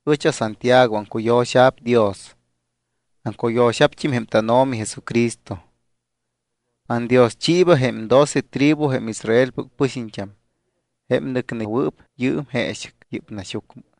Ɨch aSantiago. Aŋcuyo̱xa̱p Dios, aŋcuyo̱xa̱pt́im jém tánO̱mi Jesucristo. Andioschiiba jém doce tribu, jém Israelpɨc pɨxiñt́am, jém nɨcnewɨɨp yɨɨm jeexɨc yɨ́p naxyucmɨ.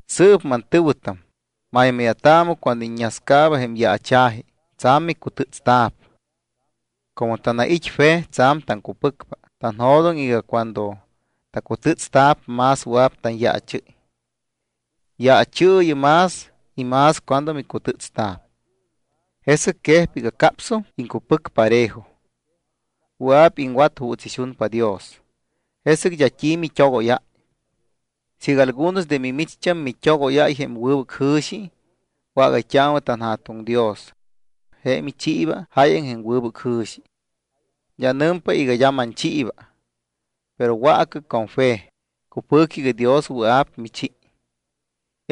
Sɨɨp mantɨ̱wɨtam, maymáya̱taamɨ cuando iññascaaba jém yaacha̱ji y tsa̱m micutɨ́tstamta̱p. Como tanait́ fe, tsa̱m taŋcupɨcpa, tanjo̱doŋ iga cuando tacutɨ́tsta̱p, más wɨa̱p tanyaachɨ́y. Yaachɨɨyɨ más y más cuando micutɨ́tsta̱p, jesɨc quejpa iga capsum iŋcupɨc parejo. Wɨa̱p iŋwat juuts ixunpa Dios. Jesɨc d́a t́i mit́ogóyáy. Siiga algunos de mimicht́am mit́ogóyáy jém wɨbɨc jɨ̱xi, wágayt́aamɨ tanJa̱tuŋ Dios. Je michiiba jáyaŋ jém wɨbɨc jɨ̱xi. D́a nɨmpa iga d́a manchiiba. Pero waacɨ con jém fe, cupɨ̱cɨ iga Dios wɨa̱p michi.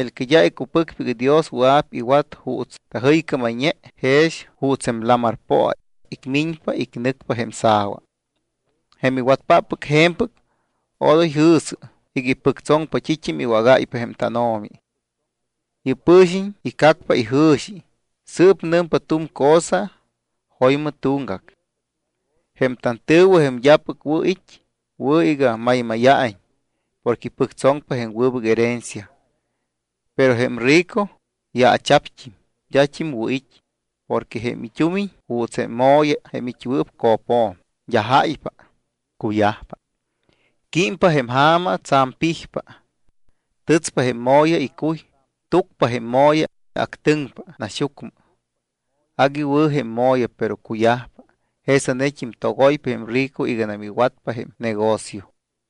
El que d́a icupɨcpa iga Dios wɨa̱p iwat juuts tajɨycámayñe, jex juuts jém lamar poa icmiñpa icnɨcpa jém sa̱wa. Jém iwatpáppɨc je̱mpɨc, odoy jɨ̱sɨ iga ipɨctsoŋpa t́it́am iwágáypa jém tánO̱mi. Yɨ́p pɨ̱xiñ icacpa ijɨ̱xi, sɨɨp nɨmpa tu̱m cosa y jo̱ymɨ tuŋgac. Jém tantɨ̱wɨ, jém d́apɨc wɨ̱ it́, wɨ̱ iga maymáya̱iñ porque ipɨctsoŋpa jém wɨbɨc herencia. Pero jém rico yaacha̱pt́im, d́at́im wɨ̱ it́, porque jém it́umiñ juuts jém mo̱ya jém it́wɨɨp co̱pjo̱m, d́a jáypa, cuyajpa. Químpa jém ja̱ma tsa̱m pijpa. Tɨtspa jém mo̱ya icuy, túcpa jém mo̱ya, actɨŋpa naxyucmɨ. Agui wɨ̱ jém mo̱ya, pero cuyajpa. Jesa̱pt́im togoypa jém rico iganam iwatpa jém negocio.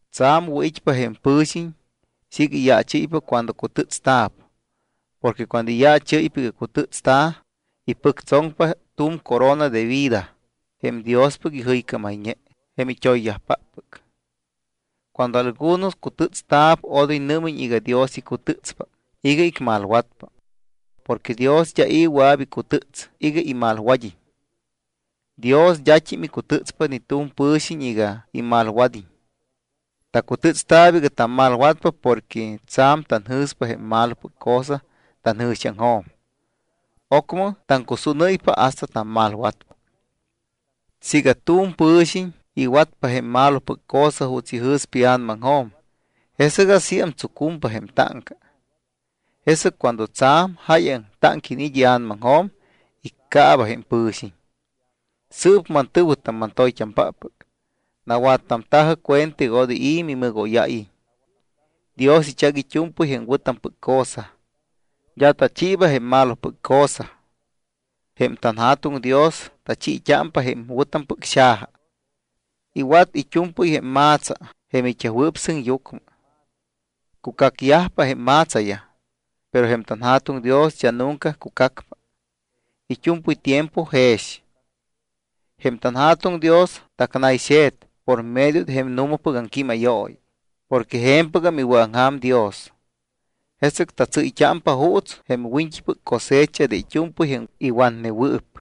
Tsa̱m wɨ̱it́pa jém pɨ̱xiñ siiga iyaachɨ́ypa cuando cutɨ́tsta̱p. Porque cuando iyaachɨ́y iga cutɨ́tsta̱, ipɨctsoŋpa tu̱m corona de vida, jém Diospɨc ijɨycámayñe jém it́oyyajpáppɨc. Cuando algunos cutɨ́tsta̱p, odoy nɨ́miñ iga Dios icutɨ́tspa iga icmalwatpa. Porque Dios d́a i̱ wɨa̱p icutɨ́ts iga imalwad́iñ. Dios d́at́im icutɨ́tspa ni tu̱m pɨ̱xiñ iga imalwad́iñ. Tacutɨ́tsta̱p iga tammalwatpa porque tsa̱m tanjɨ̱spa jém malopɨc cosa tanjɨ̱xiaŋjo̱m. Ocmɨ taŋcusúnɨ́ypa hasta tammalwatpa. Siiga tu̱m pɨ̱xiñ iwatpa jém malopɨc cosa juuts ijɨ̱spa ia̱namaŋjo̱m, jesɨc asíam tsucumpa jém táŋca. Jesɨc cuando tsa̱m jáyaŋ táŋca iniit́ ia̱namaŋjo̱m, iccaaba jém pɨ̱xiñ. Sɨɨp mantɨ̱wɨtam, mantoyt́ampáppɨc, nawattamta̱jɨ cuenta iga odoy i̱ mimɨgóyáyiñ. Dios ichac it́u̱mpɨy jém wɨ̱tampɨc cosa. D́a tachiiba jém malopɨc cosa. Jém tanJa̱tuŋ Dios tachiit́ámpa jém wɨ̱tampɨc xaja. Iwat it́u̱mpɨy jém ma̱tsa jém it́yajwɨɨp sɨŋyucmɨ. Cucacyajpa jém ma̱tsayaj, pero jém tanJa̱tuŋ Dios d́a nunca cucacpa. It́u̱mpɨy tiempo jex. Jém tanJa̱tuŋ Dios tacnayxe̱t por medio de jém nu̱mapɨc aŋquímayooyi, porque je̱mpɨgam iwɨ̱aŋja̱m Dios. Jesɨc tatsɨ́yt́ámpa juuts jém wiñt́ipɨc cosecha de it́u̱mpɨy jém iwatnewɨɨp.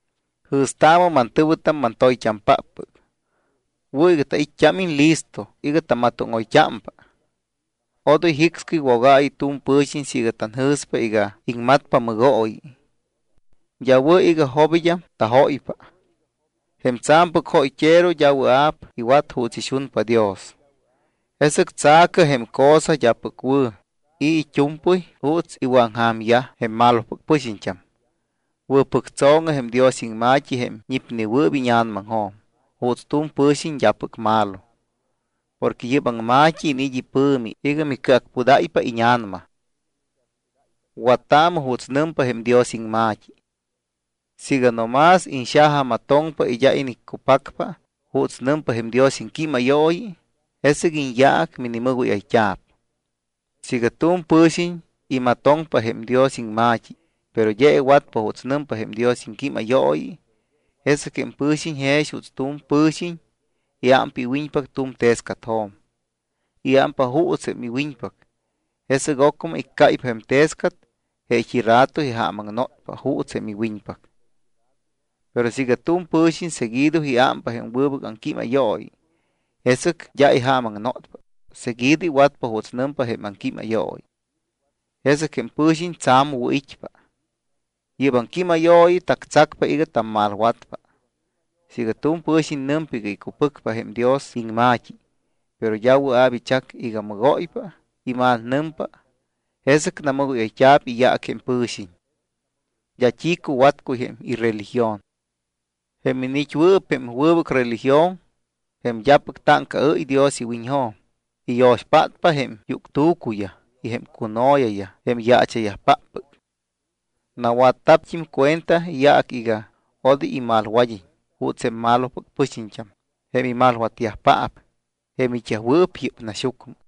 Jɨ̱staamɨ, mantɨ̱wɨtam, mantoyt́ampáppɨc, wɨ̱ iga tait́t́ámiñ listo iga tamatóŋoyt́ámpa. Odoy jicscɨy wogaayɨ tu̱m pɨ̱xiñ siiga tanjɨ̱spa iga iŋmatpa mɨgooyi. D́a wɨ̱ iga jobid́am tajóypa. Jém tsa̱mpɨc jóyt́ero d́a wɨa̱p iwat juuts ixunpa Dios. Jesɨc tsa̱cɨ jém cosa d́apɨc wɨ̱ y it́u̱mpɨy juuts iwɨ̱aŋja̱myaj jém malopɨc pɨxiñt́am. Wɨ̱pɨctso̱ŋɨ jém Dios iŋma̱t́i jém ñipnewɨɨp íña̱namaŋjo̱m juuts tu̱m pɨ̱xiñ d́apɨc malo. Porque yɨ́p aŋma̱t́i iniit́ ipɨ̱mi iga micɨacpudáypa íña̱nama. Wattaamɨ juuts nɨmpa jém Dios iŋma̱t́i. Siiga no más iñxajamatoŋpa y d́a iniccupacpa juuts nɨmpa jém Dios iŋquímayooyi, jesɨc iñyaac minimɨgóyayt́a̱p. Siiga tu̱m pɨ̱xiñ imatoŋpa jém Dios iŋma̱t́i, pero d́a iwatpa juuts nɨmpa jém Dios iŋquímayooyi, jesɨc jém pɨ̱xiñ jex juuts tu̱m pɨ̱xiñ iámpa iwiñpac tu̱m tescatjo̱m. Iámpa juuts jém iwiñpac, jesɨc ocmɨ iccáypa jém tescat, jeet́i rato ijaamaŋnotpa juuts jém iwiñpac. Pero siiga tu̱m pɨ̱xiñ seguido iámpa jém wɨbɨc aŋquímayooyi, jesɨc d́a ijaamaŋnotpa, seguido iwatpa juuts nɨmpa jém aŋquímayooyi. Jesɨc jém pɨ̱xiñ tsa̱m wɨ̱it́pa. Yɨ́p aŋquímayooyi tactsacpa iga tammalwatpa. Siiga tu̱m pɨ̱xiñ nɨmpa iga icupɨcpa jém Dios iŋma̱t́i, pero d́a wɨa̱p ichac iga mɨgóypa y malnɨmpa, jesɨc namɨgóyayt́a̱p iyaac jém pɨ̱xiñ. D́a t́i cuwatcuy jém ireligion. Jém iniit́wɨɨp jém wɨbɨc religión, jém d́apɨc táŋcaɨ́y Dios iwiñjo̱m, iyo̱xpátpa jém yuctu̱cuyaj y jém cuno̱yayaj jém yaacha̱yajpáppɨc. Nawatta̱pt́im cuenta iyaac iga odoy imalwad́iñ juuts jém malopɨc pɨxiñt́am, jém imalwatyajpaap, jém it́yajwɨɨp yɨ́p naxyucmɨ.